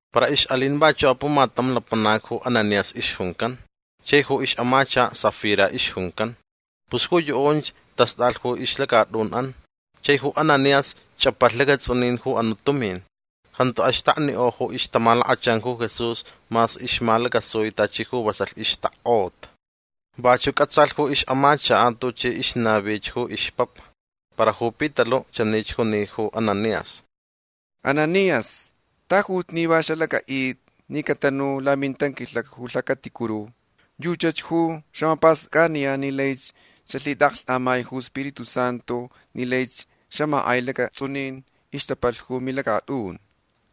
Para ixʼalin vachuʼ apumatam lapanac ju Ananías ixjuncan. Chai ju ixʼamachakaʼ Safira ixjuncan. Pus ju yuʼunch tastʼalh ju ixlacatʼunʼan. Chai ju Ananías chʼapalh lacatsʼunin ju anuʼ tumin. Jantu axtaknikʼo ju ixtamalakachan ju Jesús mas ixmalacasui tachi ju vasalh ixtakkʼota. Vachuʼ cʼatsalh ju ixʼamachakaʼ tuchi ixnavich ju ixpapa. Para ju Pitaluʼ chanich juni ju Ananías: ―Ananías tajuch ni va xalacʼaʼitʼi ni catanu lamintanquilhacni ju lhacaticuru. Yuchach ju xamapastʼacʼaniyan ni laich xalhitʼaʼaklhtʼamai ju Spiritu Santu ni laich xamakʼai lacatsʼunin ixtapalh ju milacatʼun.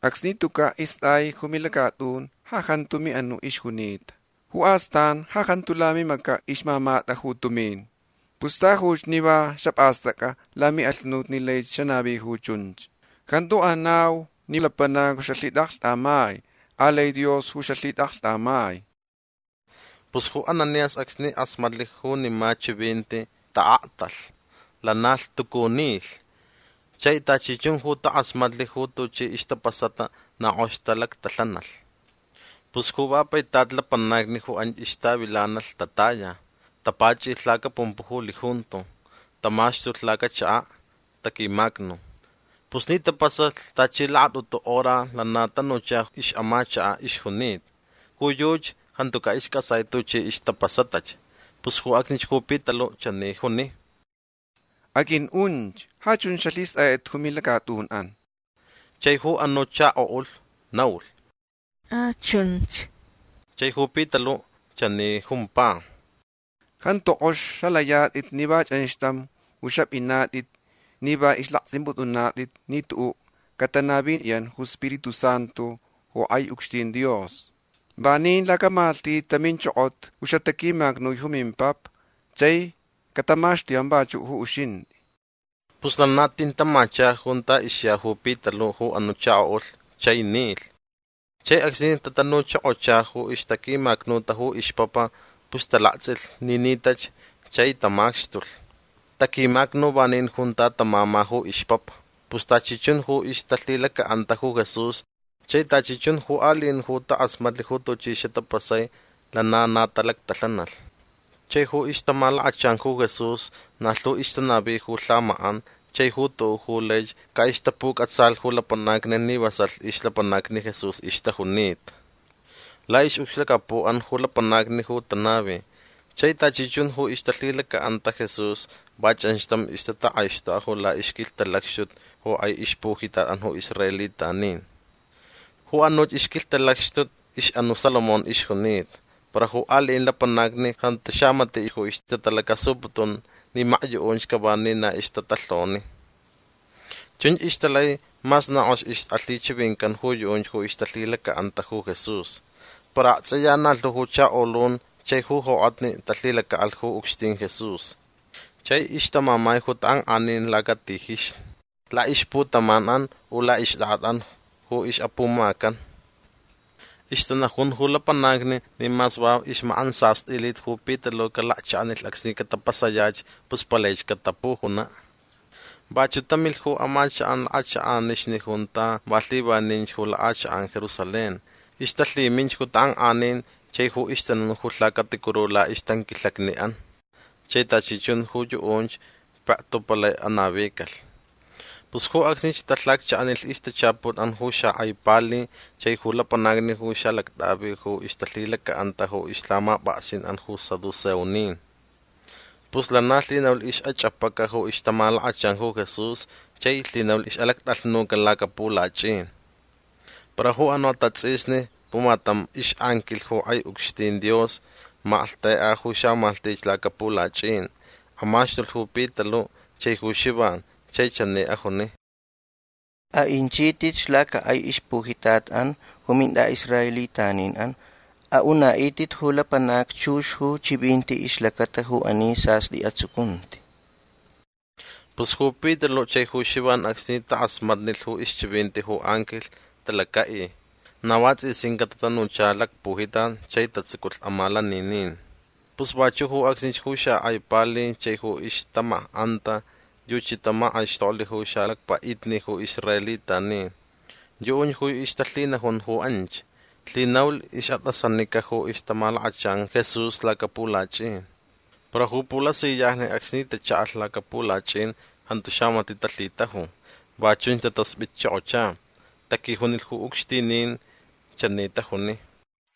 Acsni tucaʼ istʼai ju milacatʼun ja jantu miʼanuʼ ixjunita. Ju astan ja jantu lamimacaʼ ixmamatʼa ju tumin. Pus tajuch ni va xapʼastʼacʼa lamiʼalhunut ni laich xanavi ju chunch. Jantu anau ni lapanacni ju xalhitʼaʼaklhtʼamai. Alai Dios ju xalhitʼaʼaklhtʼamai. Pus ju Ananías acsni kʼasmatlh junima chivinti taʼaktalh. Lana lhtucu nilh. Chai tachi chun ju takʼasmatlh ju tuchi ixtapasata na kʼox talactalhanalh. Pus ju va paitat lapanacni ju anch ixtavilanalh tataya. Tapachʼilh lacapumpuʼ ju lijunto. Tamaxtulh lacachakaʼ. Taquimacnu. Pus ni tapasalh tachi lakatʼutu hora lana tanucha ixʼamachakaʼ ixjunita. Ju yuchi jantucaʼ iscʼatsai tuchi ixtapasatach. Pus ju acsnich ju Pitaluʼ chani juni: ―Aqʼuiʼunch. Ja chunch xalhistʼayatʼit ju milacatʼunʼan. Chai ju anuʼ chakoʼulh naulh: ―A. Chunch. Chai ju Pitaluʼ chani jumpa: ―Jantu kʼox xalayatʼit ni va chʼanxtam ju xapʼinatʼit ni va islaktsʼimpʼutʼunatʼit ni tuʼuʼ catanaviyan ju iSpiritu Santu ju kʼai ucxtin Dios. Vanin lacamalhtich taminchokota ju xataquimacnui ju mimpapa. Chai catamaxtuyanch vachuʼ ju uxintʼi. Pus lana tin tamacha junta ixya ju Pitaluʼ ju anuʼ chakoʼulh chai nilh. Chai acsni tatanuchokocha ju ixtaquimacnuta ju ixpapa pus talaktsʼilh ni nitach chai tamaxtulh. Taquimacnu vanin junta tamama ju ixpapa. Pus tachi chun ju ixtalhilacaʼanta ju Jesús chai tachi chun ju aliʼin ju takʼasmatlh ju tuchi xatapasai lana na talactalhanalh. Chai ju ixtamalakachan ju Jesús na lhu ixtanavi ju lhamakʼan chai ju tuʼuʼ ju laich caʼixtapucʼatsalh ju lapanacni ni vasalh ixlapanacni Jesús ixtajunita. Laʼixʼucxlacapuʼan ju lapanacni ju tanavi. Chai tachi chun ju ixtalhilacaʼanta Jesús va chʼanxtam ixtatakʼaixtʼokʼa laʼixquilhtalacxtuch ju kʼai ixpujitatʼan ju israelitanin. Ju anuch ixquilhtalacxtuch ixʼanuʼ Salomón ixjuncan. Para ju aliʼin lapanacni jantu xamatiʼ ju ixtatalacasuputun ni makyuʼunch cava ni na ixtatalhoni. Chunch ixtalai mas na kʼox ixʼalhichivincan ju yuʼunch ju ixtalhilacaʼanta ju Jesús. Para aktsʼiya na lhu ju chakolun chai ju jokʼatni talhilacaʼalh ju ucxtin Jesús. Chai ixtamamai ju takʼankʼanin lacatijixni. Laʼixputamanʼan u laʼixtʼakʼatʼan ju ixʼapumacan. Ixtanajun ju lapanacni ni mas va ixmakʼantsastʼilit ju Pitaluʼ calakchaʼanilh acsni catapasayach pus palaich catapujunaʼ. Vachuʼ tamilh ju amachakʼan lakʼachakʼanixni junta va lhivaninch ju lakʼachakʼan Jerusalén. Ixtalhiminch ju takʼankʼanin chai ju ixtanun ju lhacaticuru laʼixtanquilhacniʼan. Chai tachi chun ju yuʼunch pektu palai anavicalh. Pus ju acsnich talhacchaʼanilh ixtachaputʼan ju xakʼai pali chai ju lapanacni ju xaʼalactʼavi ju ixtalhilacaʼanta ju ixlhamapʼaksinʼan ju saduceonin. Pus lana lhinaulh ixʼachʼapaca ju ixtamalakachan ju Jesús chai lhinaulh ixʼalactʼalhnucalh lacapulachʼin. Para ju anuʼ atatsʼisni pumatam ixʼanquilh ju kʼai ucxtin Dios malhtekʼa ju xamalhtich lacapulachʼin. Amaxtulh ju Pitaluʼ chai ju Xivan chai chani ajuni: ―Aʼinchitʼitch lacakʼai ixpujitatʼan ju mintʼaʼisraelitaninʼan. Aʼunaʼitʼitch ju lapanacni chux ju chivinti ixlacata ju ani sastʼi atsucunti. Pus ju Pitaluʼ chai ju Xivan acsni takʼasmatnilh ju ixchivinti ju anquilh talacaʼi. Na vatsʼisincaʼ tatanucha lacpujitat chai tatsuculh amalaninin. Pus vachuʼ ju acsnich ju xakʼai pali chai ju ixtamakʼanta yuchi tamakʼaixtoklh ju xalacpaʼitni ju israelitanin. Yuʼunch ju ixtalhinajun ju anch. Lhinaulh ixʼatʼasanica ju ixtamalakachan Jesús lacapulachʼin. Para ju pulasiyajni acsni tachaʼalh lacapulachʼin jantu xamatiʼ talhitaju. Va chunch tataspʼitchokocha. Taquijunilh ju ucxtinin. Chani tajuni: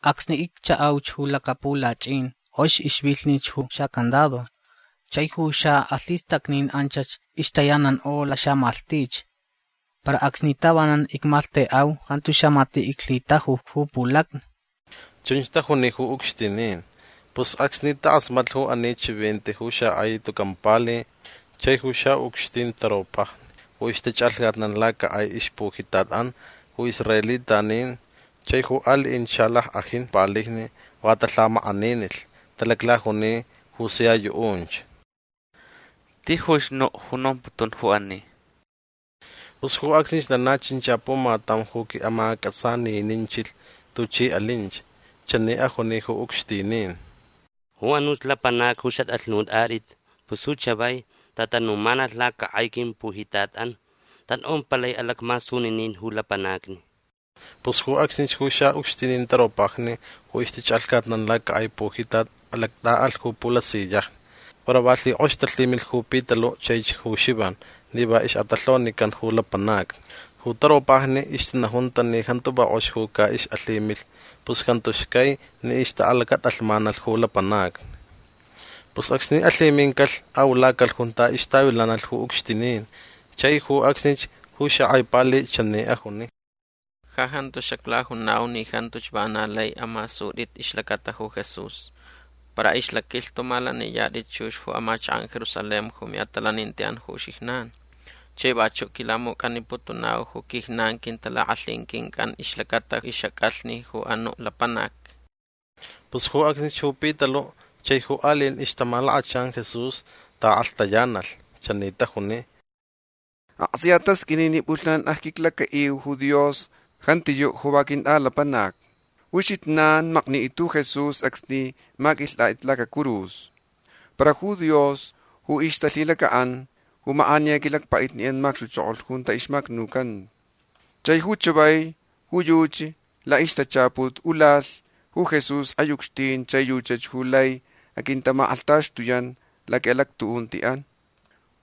―Acsni icchaʼauch ju lacapulachʼin kʼox ixvilhnilh ju xacandado. Chai ju xaʼalhistacnin anchach ixtayanankʼo laxamalhtich. Para acsni tavanan icmalhtekʼau jantu xamatiʼ iclhitaju ju pulacni. ―Chunch tajuni ju ucxtinin. Pus acsni takʼasmatlh ju ani chivinti ju xakʼai tucan pali chai ju xaʼucxtin taropajni ju ixtachʼalhcatnan lacakʼai ixpujitatʼan ju israelitanin chai ju aliʼinch xalackʼajin palijni va talhamakʼaninilh. Talaclajuni ju sia yuʼunch: ―Tijuch nuʼ ju nomputun ju ani. Pus ju acsnich lana chincha pumatam ju quiʼamacʼatsanininchilh tuchi alinch. Chani ajuni ju ucxtinin: ―Ju anuch lapanacni ju xatʼalhnutʼatʼit pus ju chavai tatanumanalh lacakʼai quimpujitatʼan. Tatʼompalai alacmasuninin ju lapanacni. Pus ju acsnich ju xaʼucxtin taropajni ju ixtachʼalhcatnan lacakʼai pujitat alactʼaʼalh ju pulasiyajni. Para va lhikʼox talhimilh ju Pitaluʼ chaich ju Xivan ni va ixʼatalhonican ju lapanacni. Ju taropajni ixtanajunta ni jantu va kʼox ju caʼixʼalhimilh pus jantu xcai ni ixtaʼalacatʼalhmanalh ju lapanacni. Pus acsni alhimincalh aʼulacalh junta ixtavilanalh ju ucxtinin. Chai ju acsnich ju xakʼai pali chani ajuni: ―Ja jantu xaclajunau ni jantuch vana laich amasutʼitch ixlacata ju Jesús. Para ixlaquilhtu malaniyatʼit chux ju amachakʼan Jerusalén ju miʼatalanintiʼan ju uxijnan. Chai vachuʼ quilamucʼaniputunau ju quijnan quintalakʼalhin quincʼan ixlacata ixʼacʼalhni ju anuʼ lapanac. Pus ju acsnich ju Pitaluʼ chai ju aliʼin ixtamalakachan Jesús taʼakʼalhtayanalh. Chani tajuni: ―Aktsʼiya tasqʼuini ni pʼulhnan acquiclacaʼiu ju Dios. Jantiyuʼ ju va quintʼalapanac. Ju uxijnan maknitʼit ju Jesús acsni maquilhtʼatʼit lacacurus. Para ju Dios ju ixtalhilacaʼan ju makʼaniya quilacpaʼitniʼan macxtuchokolh junta ixmacnucanta. Chai ju chavai ju yuchi laʼixtachaput ulalh ju Jesús kʼai ucxtin chai yuchi ju lai aquintamakʼalhtaxtuyan laquiʼalactuʼuntiʼan.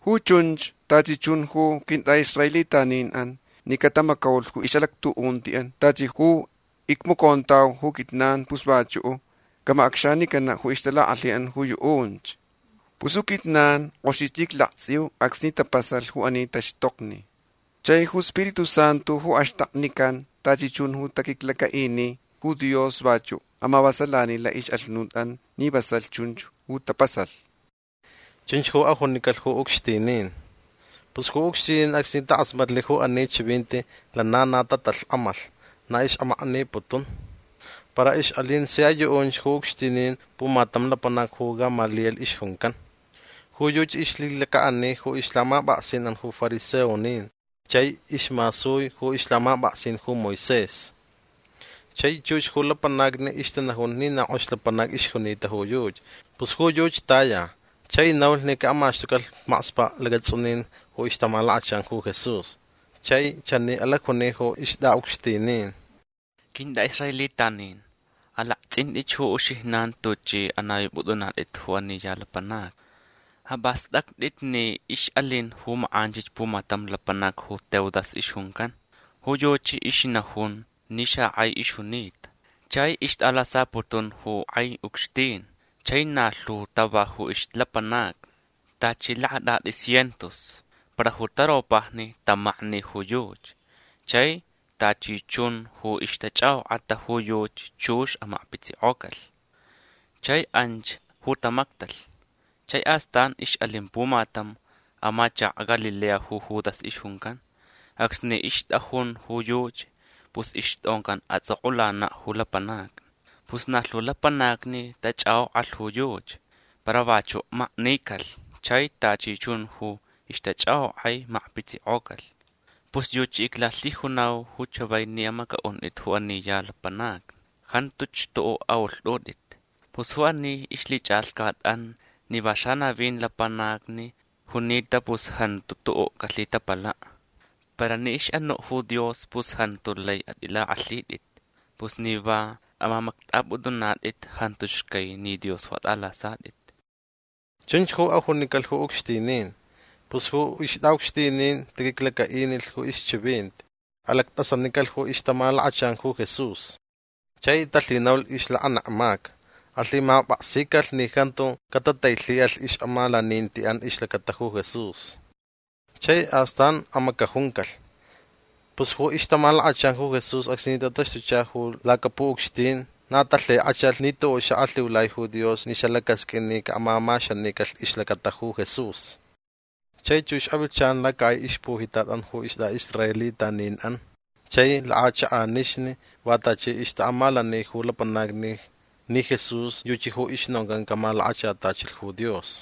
Ju chunch tachi chun ju quintʼaʼisraelitaninʼan ni catamacaulh ju ixʼalactuʼuntiʼan tachi ju icmacontauch ju quijnan pus vachuʼ camacʼacxanicanaʼ ju ixtalakʼalhinʼan ju yuʼunch. Pus ju quijnan kʼoxich iclaktsʼiuch acsni tapasalh ju ani taxtokni chai ju Spiritu Santu ju axtaknican tachi chun ju taquiclacaʼini ju Dios vachuʼ amavasalani laʼixʼalhunutʼan ni vasalh chunch ju tapasalh. ―Chunch ju ajunicalh ju ucxtinin. Pus ju ucxtinin acsni takʼasmatlh ju ani chivinti lana na tatalhkʼamalh. Na ixʼamakniputun. Para ixʼalin sia yuʼunch ju ucxtinin pumatam lapanac ju Gamaliel ixjuncan. Ju yuchi ixlhilacaʼani ju ixlhamapʼaksinʼan ju fariseonin chai ismasui ju ixlhamapʼaksin ju Moisés. Chai chux ju lapanacni ixtanajun ni na kʼox lapanac ixjunita ju yuchi. Pus ju yuchi taya chai naulh ni caʼamaxtucalh makspaʼ lacatsʼunin ju ixtamalakachan ju Jesús. Chai chani alacjuni ju ixtʼaʼucxtinin: ―Quintʼaʼisraelitanin alaktsʼintʼitch ju uxijnan tuchʼi anavipʼutʼunatʼit ju ani ya lapanacni. Apʼastʼactʼit ni ixʼalin ju makʼanchich pumatam lapanac ju Teudas ixjuncan. Ju yuchi ixnajun ni xakʼai ixjunita. Chai ixtʼalasaputun ju kʼai ucxtin. Chai na lhu tava ju ixlapanacni. Tachi lakatʼatʼi cientos. Para ju taropajni tamakni ju yuchi. Chai tachi chun ju ixtachʼakʼokʼata ju yuchi chux amakpitsikʼocalh. Chai anchach ju tamactalh. Chai astan ixʼalin pumatam amachakaʼ Galilea ju Judas ixjuncan. Acsni ixtʼajun ju yuchi pus ixtʼoncan atsʼokʼulanaʼ ju lapanacni. Pus na lhu lapanacni tachʼakʼokʼalh ju yuchi. Para vachuʼ maknicalh chai tachi chun ju ixtachʼakʼokʼai amakpitsikʼocalh. Pus yuchi iclalhijunau ju chavai ni amacʼaʼuntʼit ju ani ya lapanacni. Jantu xtuʼuʼ aʼulhtʼutʼit. Pus ju ani ixlhichʼalhcatʼan ni va xanavin lapanacni junita pus jantu tuʼuʼ calhitapalaʼ. Para ni ixʼanuʼ ju Dios pus jantu lai atʼilakʼalhitʼit. Pus ni va amamactʼapʼutʼunatʼit jantu xcai ni Dios ju atʼalasatʼit. ―Chunch ju ajunicalh ju ucxtinin. Pus ju ixtʼaʼucxtinin taquiclacaʼinilh ju ixchivinti. Alactʼasanicalh ju ixtamalakachan ju Jesús. Chai talhinaulh ixlakanekmaca. Alhimapʼaksicalh ni jantu catatailhiʼalh ixʼamalanintiʼan ixlacata ju Jesús. Chai astan amacajuncalh. Pus ju ixtamalakachan ju Jesús acsni tataxtucha lacapuʼucxtin na talhikʼachalh ni tuʼuʼ xaʼalhiulai ju Dios ni xalacasqʼuin ni caʼamamaxanicalh ixlacata ju Jesús. Chai chux avilhchan lacakʼai ixpujitatʼan ju istʼaʼisraelitaninʼan chai lakʼachakʼanixni va tachi ixtaʼamalani ju lapanacni ni Jesús yuchi ju ixnoncan camalakachatachilh ju Dios.